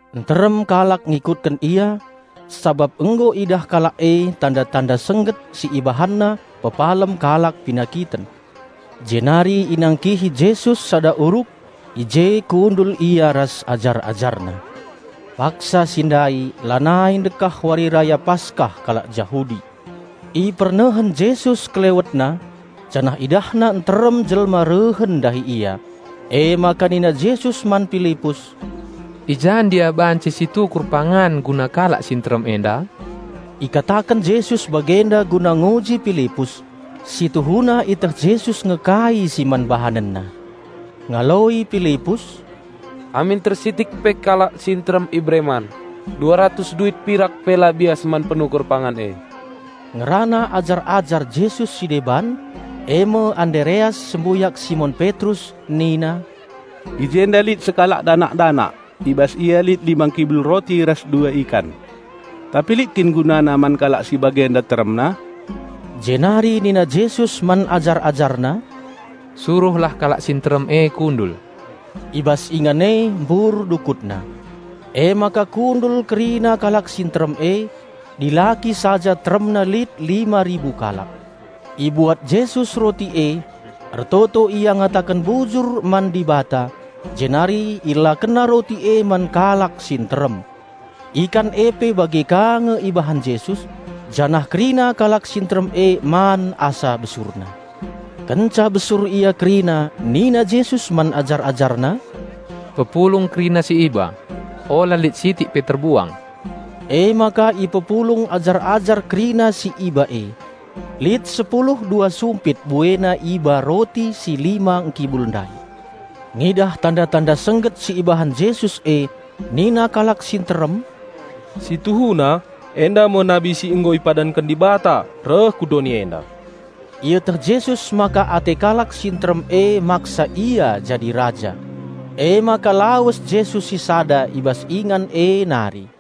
Nterem kalak ngikutken Ia sabap nggo idah kalak e tanda-tanda sengget si IbahanNa pepalem kalak penakiten. Jenari inangkihi Jesus sada uruk; i je kundul Ia ras ajar-AjarNa. Paksa si ndai lanai ndekah Wari Raya Paskah kalak Jahudi. Ipernehen Jesus KelewetNa janah IdahNa nterem jelma rehen ndahi Ia. Emaka nina Jesus man Pilipus, "I ja ndia banci situkur pangan guna kalak si nterem enda?" (Ikataken Jesus bagenda guna nguji Pilipus; si tuhuna ieteh Jesus nge kai si man BahanenNa.) Ngaloi Pilipus, "Amin tersitik pe kalak si nterem ibere man, dua ratus duit pirak pe la bias man penukur pangan e." Ngerana ajar-ajar Jesus si deban, e me Andereas sembuyak Simon Petrus nina, "I jenda lit sekalak danak-danak; i bas ia lit lima ngkibul roti ras dua ikan. Tapi lit kin gunana man kalak si bagenda teremna?" Jenari nina Jesus man ajar-AjarNa, "Suruhlah kalak si nterem e kundul." (I bas ingan e mbur dukutna.) Emaka kundul kerina kalak si nterem e; dilaki saja teremna lit lima ribu kalak. Ibuat Jesus roti e, ertoto Ia ngataken bujur man Dibata jenari IelakenNa roti e man kalak si nterem. Ikan e pe bage ka nge ibahan Jesus, janah kerina kalak si nterem e man asa besurna. Kenca besur ia kerina nina Jesus man ajar-AjarNa, "Pepulung kerina si iba; ola lit sitik pe terbuang." Emaka ipepulung ajar-ajar kerina si iba e. Lit sepulu dua sumpit buena iba roti si lima ngkibul ndai. Ngidah tanda-tanda sengget si ibahan Jesus e nina kalak si nterem, "Si tuhuna enda me nabi si nggo ipadanken Dibata reh ku doni enda!" Ieteh Jesus maka ate kalak si nterem e maksa Ia jadi raja. Emaka lawes Jesus sisada i bas ingan e nari.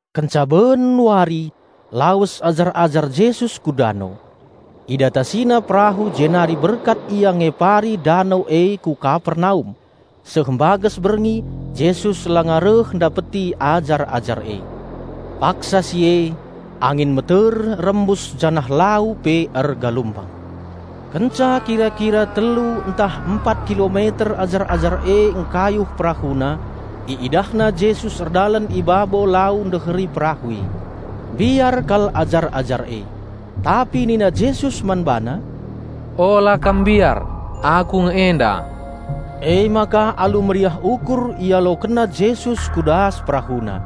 Kenca ben wari lawes ajar-ajar Jesus ku dano. Idatasina perahu jenari berkat ia ngepari dano e ku Kapernaum. Seh mbages berngi, Jesus langa reh ndapeti ajar-ajar e. Paksa si e angin meter rembus janah lau pe ergalumbang. Kenca kira-kira telu ntah empat kilometer ajar-ajar e engkayuh perahuna, iidahna Jesus erdalan i babo lau ndeheri perahu e. Mbiar kal ajar-ajar e. Tapi nina Jesus man bana, "Ola kam mbiar, Aku nge enda!" Emaka alu meriah ukur ialokenna Jesus ku das perahuna.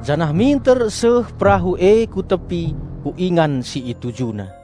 Janah minter seh perahu e ku tepi, ku ingan si itujuna.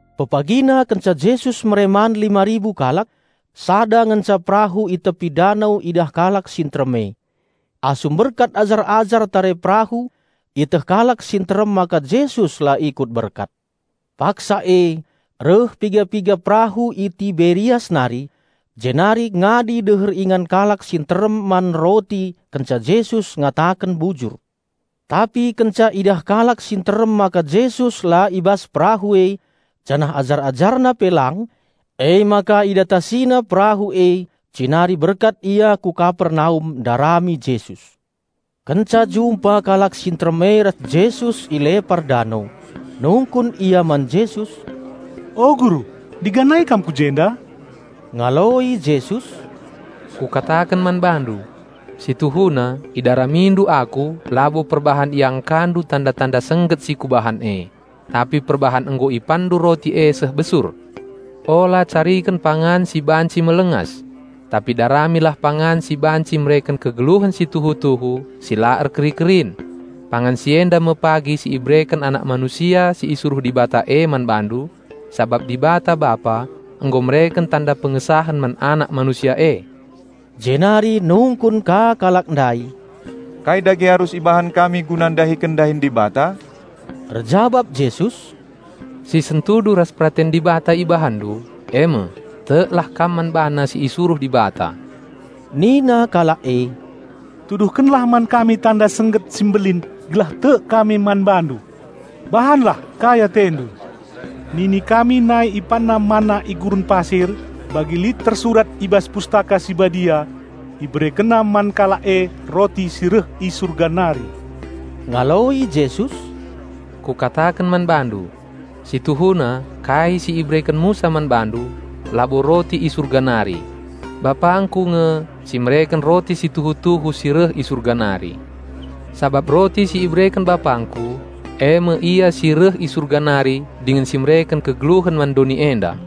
Pepagina kenca Jesus mere man lima ribu kalak, sada ngenca perahu i tepi dano idah kalak si nterem e. Asum berkat ajar-ajar tare perahu ieteh kalak si nterem maka Jesus la ikut berkat. Paksa e reh piga-piga perahu i Tiberias nari, jenari ngadi deher ingan kalak si nterem man roti kenca Jesus ngataken bujur. Tapi kenca idah kalak si nterem maka Jesus la i bas perahu e janah ajar-AjarNa pe lang, emaka idatasina perahu e jenari berkat ia ku Kapernaum ndarami Jesus. Kenca jumpa kalak si nterem e ras Jesus i lepar dano, nungkun ia man Jesus, "O Guru, ndiganai Kam ku jenda?" Ngaloi Jesus, "Kukataken man bandu: Si tuhuna idaramindu Aku labo perbahan iangkandu tanda-tanda sengget si Kubahan e, tapi perbahan nggo ipanndu roti e seh besur. Ola cariken pangan si banci melengas. Tapi daramilah pangan si banci mereken kegeluhen si tuhu-tuhu si la erkeri-kerin. Pangan si enda me pagi si ibereken Anak Manusia si isuruh Dibata e man bandu, sabap Dibata Bapa nggo mereken tanda pengesahen man Anak Manusia e." Jenari nungkun ka kalak ndai, "Kai dage arus ibahan kami guna ndahiken dahin Dibata?" Erjabap Jesus, "Si sentudu ras peraten Dibata ibahanndu, e me: Teklah kam man BaNa si isuruh Dibata." Nina kalak e, "Tuduhkenlah man kami tanda sengget si mbelin gelah tek kami man BaNdu. Bahanlah kai AteNdu. Nini kami nai ipanna manna i gurun pasir, bagi lit tersurat i bas Pustaka Si Badia, 'IberekenNa man kalak e roti si reh i Surga nari.'" Ngaloi Jesus, "Kukataken man bandu: Si tuhuna kai si ibereken Musa man bandu, labo roti i Surga nari. BapangKu nge si mereken Roti si tuhu-tuhu si reh i Surga nari. Sabap Roti si ibereken BapangKu, e me Ia si reh i Surga nari dingen si mereken kegeluhen man doni enda."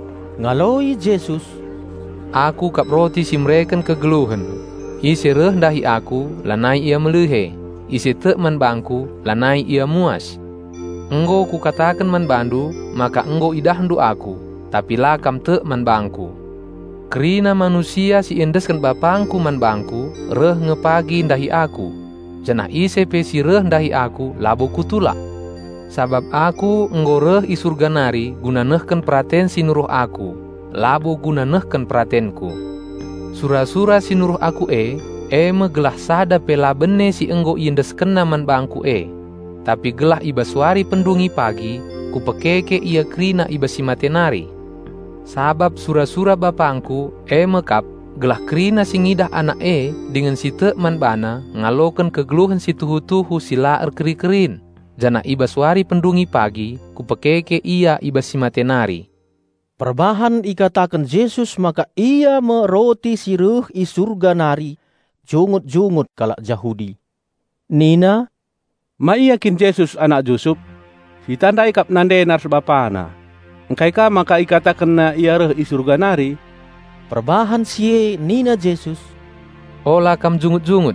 Ngaloi Jesus, "Aku kap Roti si mereken kegeluhen. Ise reh ndahi Aku, lanai ia melihe; ise tek man bangKu lanai ia muas. Nggo Kukataken man bandu maka nggo idahndu Aku, tapi la kam tek man bangKu. Kerina manusia si iendesken BapangKu man bangKu reh nge pagi ndahi Aku. Janah ise pe si reh ndahi Aku labo Kutulak. Sabap Aku nggo reh i Surga nari guna nehken peraten si nuruh Aku, labo guna nehken peratenKu. Sura-sura si Nuruh Aku e, e me gelah sada pe la bene si nggo IendeskenNa man bangKu e; tapi gelah i bas wari pendungi pagi Kupekeke ia kerina i bas si mate nari. Sabap sura-sura BapangKu, e me kap: gelah kerina si ngidah Anak e dingen si tek man BaNa ngaloken kegeluhen si tuhu-tuhu si la erkeri-kerin, janah i bas wari pendungi pagi Kupekeke ia i bas si mate nari." Perbahan ikataken Jesus maka Ia me Roti si reh i Surga nari, jungut-jungut kalak Jahudi. Nina, "Ma ia kin Jesus anak Jusup? Sitandai kap nandena ras bapana. Ngkai ka maka ikatakenna Ia reh i Surga nari?" Perbahan si e nina Jesus, "Ola kam jungut-jungut.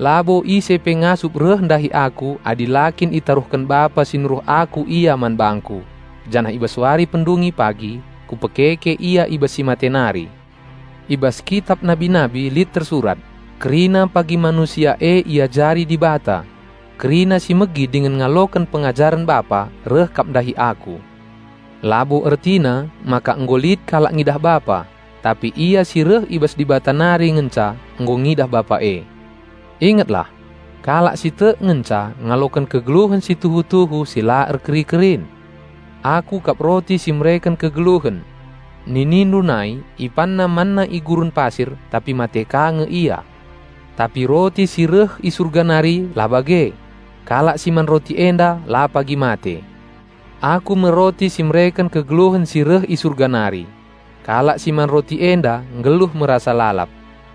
Labo ise pe ngasup reh ndahi Aku adi la kin itaruhken Bapa si nuruh Aku ia man bangKu; janah i bas wari pendungi pagi Kupekeke ia i bas si mate nari. I bas kitap nabi-nabi lit tersurat, 'Kerina pagi manusia e iajari Dibata.' Kerina si megi dingen ngaloken pengajaren Bapa reh kap ndahi Aku. Labo ertina maka nggo lit kalak ngidah Bapa; tapi Ia si reh i bas Dibata nari ngenca nggo ngidah Bapa e. Ingetlah! Kalak si tek ngenca ngaloken kegeluhen si tuhu-tuhu si la erkeri-kerin. Aku kap Roti si mereken kegeluhen. Ninindu nai, ipanna manna i gurun pasir, tapi mate ka nge ia. Tapi Roti si reh i Surga nari la bage. Kalak si man Roti enda la pagi mate. Aku me Roti si mereken kegeluhen si reh i Surga nari. Kalak si man Roti enda nggeluh me rasa lalap.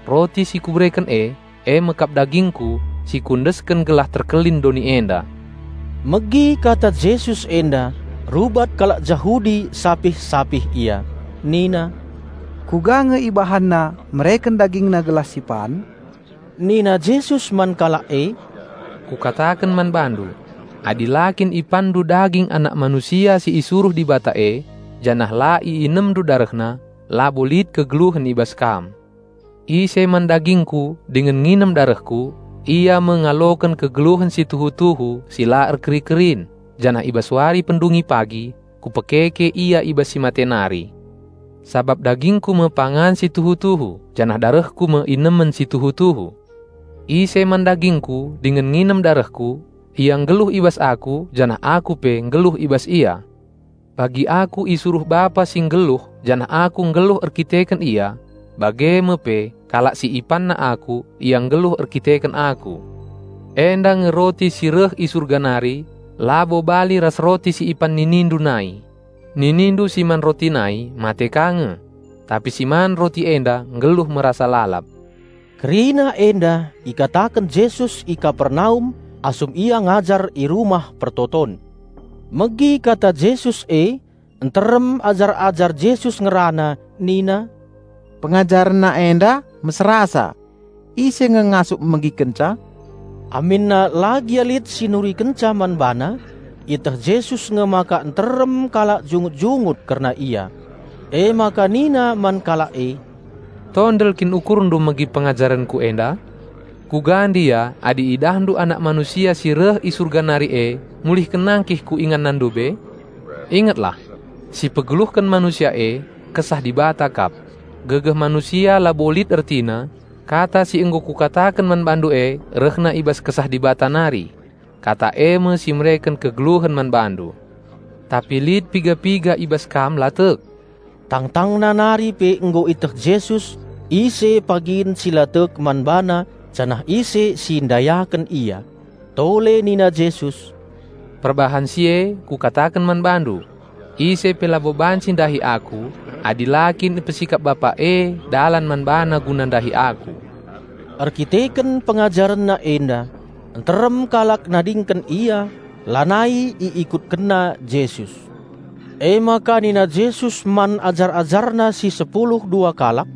Roti si Kubereken e, e me kap dagingKu, si Kuendesken gelah terkelin doni enda." Megi kata Jesus enda rubat kalak Jahudi sapih-sapih ia. Nina, "Kuga nge ibahanna mereken dagingna gelah si pan?" Nina Jesus man kalak e, "Kukataken man bandu: Adi la kin ipanndu daging Anak Manusia si isuruh Dibata e, janah la iinemndu DarehNa, labo lit kegeluhen i bas kam. Ise man dagingKu dingen nginem darehKu, ia me ngaloken kegeluhen si tuhu-tuhu si la erkeri-kerin, janah i bas wari pendungi pagi Kupekeke ia i bas si mate nari. Sabap dagingKu me pangan si tuhu-tuhu janah darehKu me inemen si tuhu-tuhu. Ise man dagingKu dingen nginem darehKu, ia nggeluh i bas Aku janah Aku pe nggeluh i bas ia. Bagi Aku isuruh Bapa si nggeluh janah Aku nggeluh erdandanken Ia, bage me pe kalak si ipanna Aku, ia nggeluh erdandanken Aku. Enda nge Roti si reh i Surga nari, labo bali ras roti si ipan ninindu nai. Ninindu si man roti nai, mate ka nge. Tapi si man Roti enda nggeluh me rasa lalap." Kerina enda ikataken Jesus i Kapernaum asum Ia ngajar i rumah persembahen. Megi kata Jesus e, nterem ajar-ajar Jesus ngerana nina, "PengajarenNa enda meserasa. Ise nge ngasup megikenca?" Aminna la gia lit si nurikenca man BaNa, ieteh Jesus nge maka nterem kalak jungut-jungut kerna Ia. Emaka nina man kalak e, "Tondel kin ukurndu megi pengajarenKu enda? Kuga ndia adi idahndu Anak Manusia si reh i Surga nari e mulihken nangkih ku inganna ndube? Ingetlah! Si pegeluhken manusia e, Kesah Dibata kap. Gegeh manusia labo lit ertina. Kata si nggo Kukataken man bandu e rehna i bas Kesah Dibata nari. Kata e me si mereken kegeluhen man bandu. Tapi lit piga-piga i bas kam la tek." (Tangtangna nari pe nggo iteh Jesus ise pagin si la tek man BaNa janah ise si ndayaken Ia.) Tole nina Jesus, "Perbahan si e Kukataken man bandu: Ise pe labo banci ndahi Aku adi la kin ipesikap Bapa e dalan man bana guna ndahi Aku." Erdandanken PengajarenNa enda, nterem kalak nadingken Ia, lanai iikutkenna Jesus. Emaka nina Jesus man ajar-AjarNa si sepulu dua kalak,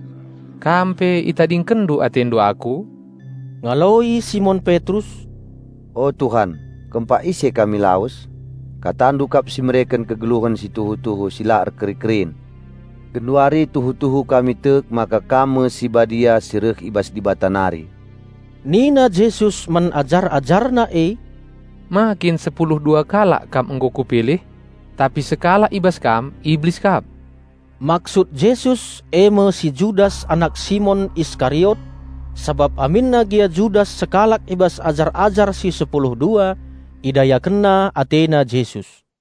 "Kam pe itadingkenndu atendu Aku?" Ngaloi Simon Petrus, "O Tuhan, kempak ise kami lawes? Katandu kap si mereken kegeluhen si tuhu-tuhu si la erkeri-kerin. Genduari tuhu-tuhu kami tek maka Kam me si Badia si reh i bas Dibata nari." Nina Jesus man ajar-AjarNa e, "Ma kin sepulu dua kalak kam nggo Kupilih? Tapi sekalak i bas kam Iblis kap." Maksud Jesus e me si Judas anak Simon Iskariot; sabap aminna gia Judas sekalak i bas ajar-ajar si sepulu dua, idayakenna atena Jesus.